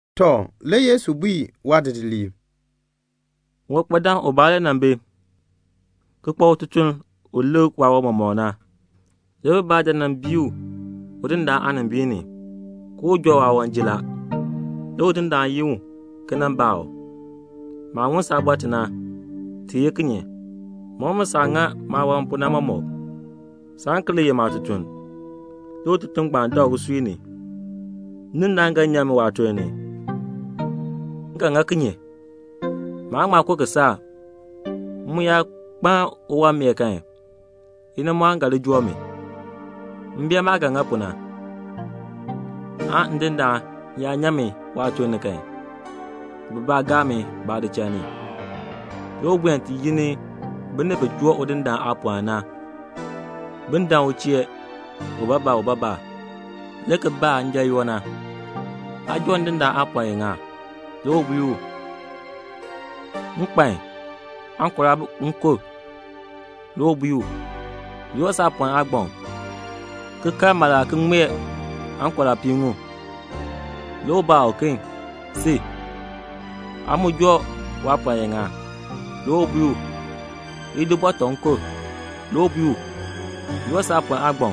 Tɔ, le Yesu bui waadidiliib, "Uwankpadaan ubaa le nan bi ki kpa ututuln u lik waawan mɔmɔk na. Le bibaa dan nan bii u udindaan aanimbiin ni ke u joo waawan jin la. Le udindaan yin u le ki nan baa u, 'Maah ŋun saabɔr ti na, ti ye kinye? Mɔk mi saah ŋa maawan pu na mɔmɔk. Saan ki li ye maatutuln.' Le ututuln ngbaan dak usui ni, 'Ndindaan ga nyan mi waatuln ni. M ga ŋa kinye? Maan ŋma ko kisaak. M mu yaa kpaln uwanmeer kan, inimɔɔn ga li joo mi. M bee maah ga ŋa pu na, aan ndindaan yaa nyan mi waatuln ni kan, bibaa gaa mi baadichal ni.' Le u buen ti yi ni binib bi joo udindaan aapɔln na, bin dan u chee ubaabaa ubaabaa, le ki baa njanyoo, 'Aa joo ndindaan aapɔln iŋa?' Le u bui u, 'Nkpan aŋkora nkub.' Le u bui u, 'Di saapɔln aagbaŋ ki kal mala ki ŋmee aŋkora piiŋmu.' Le u baa uken, 'Si, aa mu joo waapɔln iŋa?' Le u bui u, 'Idi bɔtɔ nkub.' Le u bui u, 'Di saapɔln aagbaŋ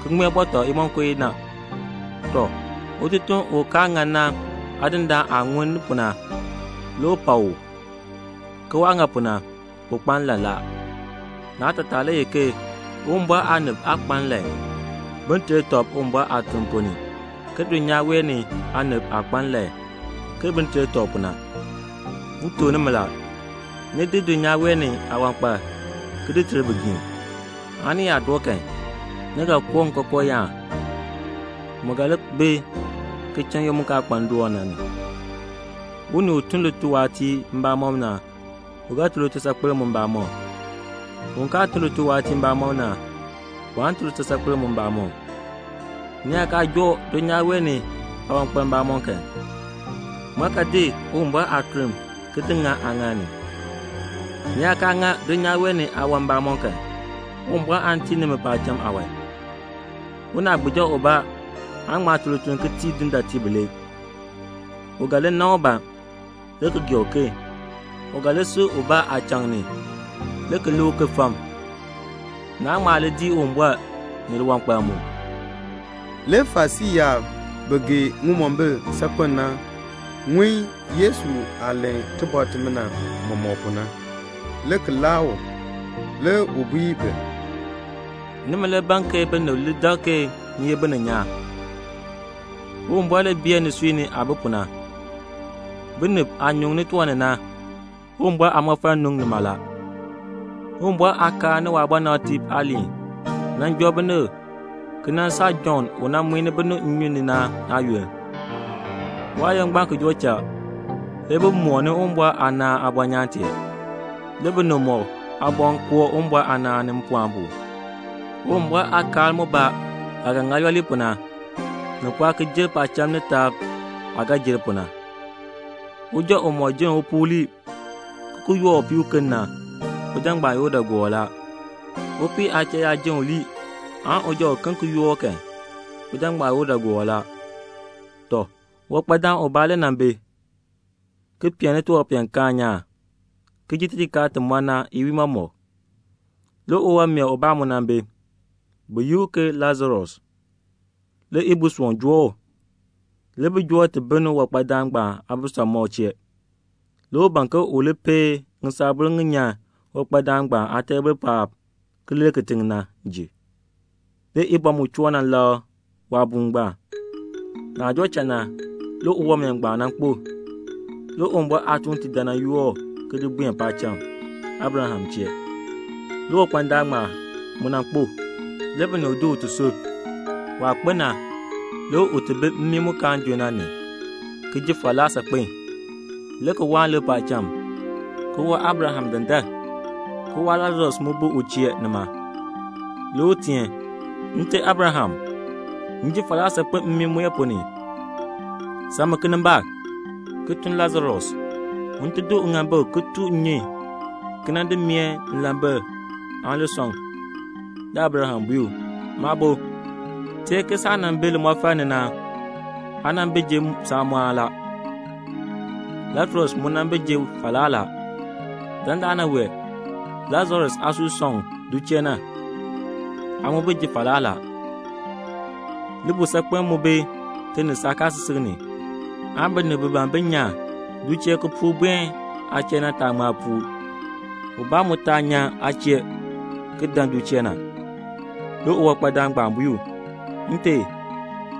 ki ŋmee bɔtɔ imonko inaa.' Tɔ, ututuln u kaa ŋan na aadindaan aah ŋun ni pu na, le u pak u, ke waah ŋa pu na, u kpa nlan la. Naatataa le ye ke Uwumbɔr aanib aa kpa nlan bin ter tɔb Uwumbɔr aatuln ponn ni ke dulnyaa wee ni aanib aah kpa nlan ke bin ter tɔb pu na. "M tuk nimi la, ni di dulnyaa wee ni aawankpal ki ter bigiim, aan ni yaa doo kan, ni ga koo nkookooyaan mu ga li bi ki cha n-yoonn mu kaa kpa ndoon na. Unii u tun lituwaatiir mbamɔm na, u ga tun litusaakpeln mu mbamɔm. Un kaa tun lituwaatiir mbamɔm na, waan tun litusaakpeln mu mbamɔm. Ni yaa kaa joo dulnyaa wee ni aawankpal mbamɔm kan, ŋmaa ga di Uwumbɔr aatuln ki di ŋa aaŋaal ni? Ni yaa kaa ŋa dulnyaa wee ni aawan mbamɔm kan, Uwumbɔr aan tii nimi paacham aawan. "Unaagbiija ubaa aan ŋma tun lituln ki tii dindaatiib bilee. U ga li nan ubaa, le ki li gee uken. U ga li si ubaa aachaŋ ni, le ki lik uken fam. Naan ŋma dii Uwumbɔr ni liwankpal mu." Le Farisii yaab, bi gee ŋimombil saakpen na, ŋun Yesu aah len tibɔr timina mɔmɔk na, le ki laa u. Le u bui bi, "Nimi le ban ke binib li dak ke ni ye bininyaan. Uwumbɔr le bee nisui ni aah bi pu na. Binib aah nyuŋni tiwan ni na, Uwumbɔr aamɔfal nu nima la. "Uwumbɔr aakaal ni waabɔnabtiib aaliin nan joo binib ki nan saa Jɔnn u nan muin binib nnyun ni na aayoonn. Waayoonn ngbaan ki joo cha, le bi mooni Uwumbɔr aanaan aabɔnyaan tee. Le binib mɔk aaboŋ koo Uwumbɔr aanaan ni mpɔɔn pu. Uwumbɔr aakaal mubaa aah ga ŋa yooli pu na, ni pɔɔ ki jer paacham ni taab aah ga jer pu na. "Uja umɔk jenn upuu lii ki ki yoor upii uken na, uja ngbaan ye udaagoor la. Upii aachal yaa jenn u lii kan, uja uken yaa yoor u kan, uja ngbaan ye udaagoor la." "Tɔ, uwankpadaan ubaa le nan bi, ki peen tiwanpeenkaan nyaan, ki ji tijikaar ti mɔ na iwiin mɔmɔk. Le uwanmeer ubaa mu nan bi, bi yi u ke Lasarus. Le ibusoon joo u. Le bi di u ki di bil uwankpadaan ngbaan aabisamɔb chee. Le u ban ke un peei ŋisaabur ŋi nyan uwankpadaan ngbaan aateebl paab ki lir kitiŋ na. Le ibɔ mu dan nan bi lakr waabuun ngbaan. Naah joo cha na, le uwanmeer ngbaan nan kpo. Le Uwumbɔr aatuuntiib dan nan yoor u ki di buen paacham, Abraham chee. Le uwankpadaan ngbaan mu nan kpo. Le binib di u ki di sub. Waah kpo na, le u ti bi mmii mu kaan junn na ni, ki ji falaa saakpen, le ki waani lik paacham, ki waa Abraham dandar, ki waa Lasarus mu bi u chee nima. Le u teen, 'Nte Abraham, m ji falaa saakpen mmii mue ponn ni; sam mi kinimbaak, ki tun Lasarus un ti di uŋaambik ki tu nnyun ki nan di meeh nlambil aan li sɔŋ.' Le Abraham bui u, 'Maabo, teer ke saah nan bi limɔfal ni na, aa nan bi ji saamɔɔn la. Lasarus mu nan bi ji falaa la. Dandana wee Lasarus aasui sɔŋ du chee na. Aa mu bi ji falaa la. Libuusaakpeln mu bi ti ni saakaasisik ni aan binib bi ban bin nyan du chee ki puur buen aa chee na, bi taa ŋma puur, ubaa mu taa nyan aa chee ki dan du chee na.' Le uwankpadaan ngbaan bui u, 'Nte,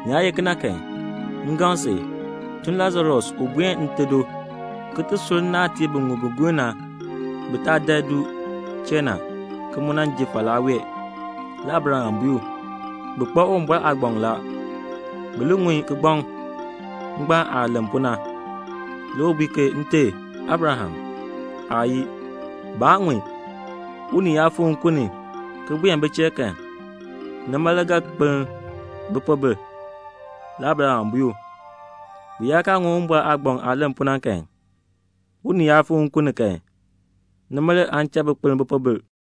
ni yaa ye kena kan, m gaŋ si, tun Lasarus un buen nte do ki ti sur nnaatiib biŋmu bi gur na, bi taa dan du chee na, ki mu nan ji falaa wee.' Le Abraham bui u, 'Bi kpa Uwumbɔr aagbaŋ la. Bi li ŋun kigbaŋ ngbaan aah len pu na.' Le u bui ke 'Nte Abraham, aayii, baan ŋun; unii yaa fikr nkun ni ki buen bi chee kan, nima le bi ga kpeln bipoobil.' Le Abraham bui u, 'Bi yaa kaa ŋun Uwumbɔr aagbaŋ aah len pu na kan, unii yaa fikr nkun ni kan, nima le aan cha bi kpeln bipoobil."'